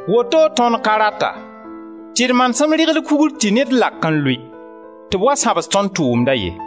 Woto tõnd ka rata tɩ d manesem rɩgl kugr tɩ ned lak n lʋɩ tɩ b wa sãbs tõnd tʋʋmda ye.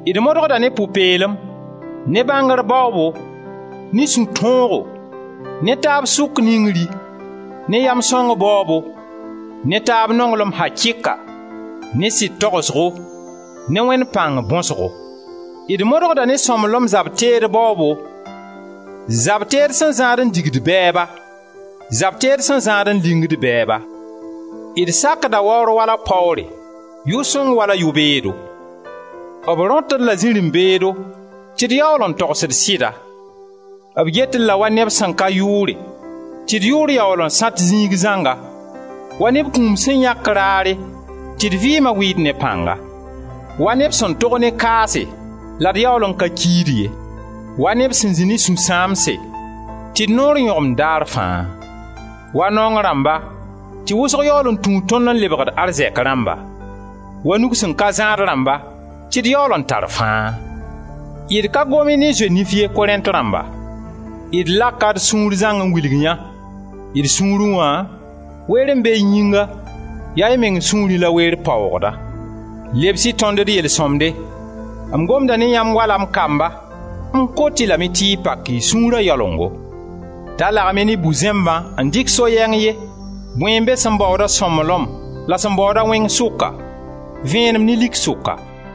d modgda ne pʋ-peelem, ne bãngr baoobo, ne sũ-tõogo, ne taab sʋk ningri, ne yam sõng baoobo, ne taab nonglem akɩka, ne sɩd togsgo, ne Wẽnd pãng bõsgo; d modgda ne sõmblem zab-teed baoobo, zab-teed sẽn zãad n digd bɛɛba, zab-teed sẽn zãad n ligind bɛɛba. D sakda waoor wala paoore, yʋ-sõng wala yʋ-beedo. B rõt-d la zirẽ-beedo tɩ d yaool n togsd sɩda, b get-d la wa neb sẽn ka yʋʋre, tɩ d yʋʋr yaool n sãt zĩig zãnga, wa neb kũum sẽn yãk raare tɩ d vɩɩma wɩɩd ne pãnga; wa neb sẽn tog ne kaase la d yaool n ka kiid ye; wa neb sẽn zĩ ne sũ-sãamse, tɩ d noor yõgemd daar fãa; wa naong rãmba tɩ wʋsg yaool n tũud tõnd n lebgd arzɛk rãmba; wa nug sẽn ka zãad rãmba, tɩ d yaool n tar fãa. D ka gom-y ne zoe-nif ye, Korẽnt dãmba, d laka d sũur zãng n wilg yã. D sũurẽ wã weer be y yĩnga, ya y meng sũurẽ la weer paoogda. Lebs-y tõnd d yel-sõmde; m gomda ne yãmb wala m kamba, m kot-y lame tɩ y pak y sũura yalengo. Da lagem-y ne bu-zẽmbã n dɩk so-yɛng ye. Bõe n be sẽn baood-a sõmblem la sẽn baooda wẽng sʋka, vẽenem ne lik sʋka?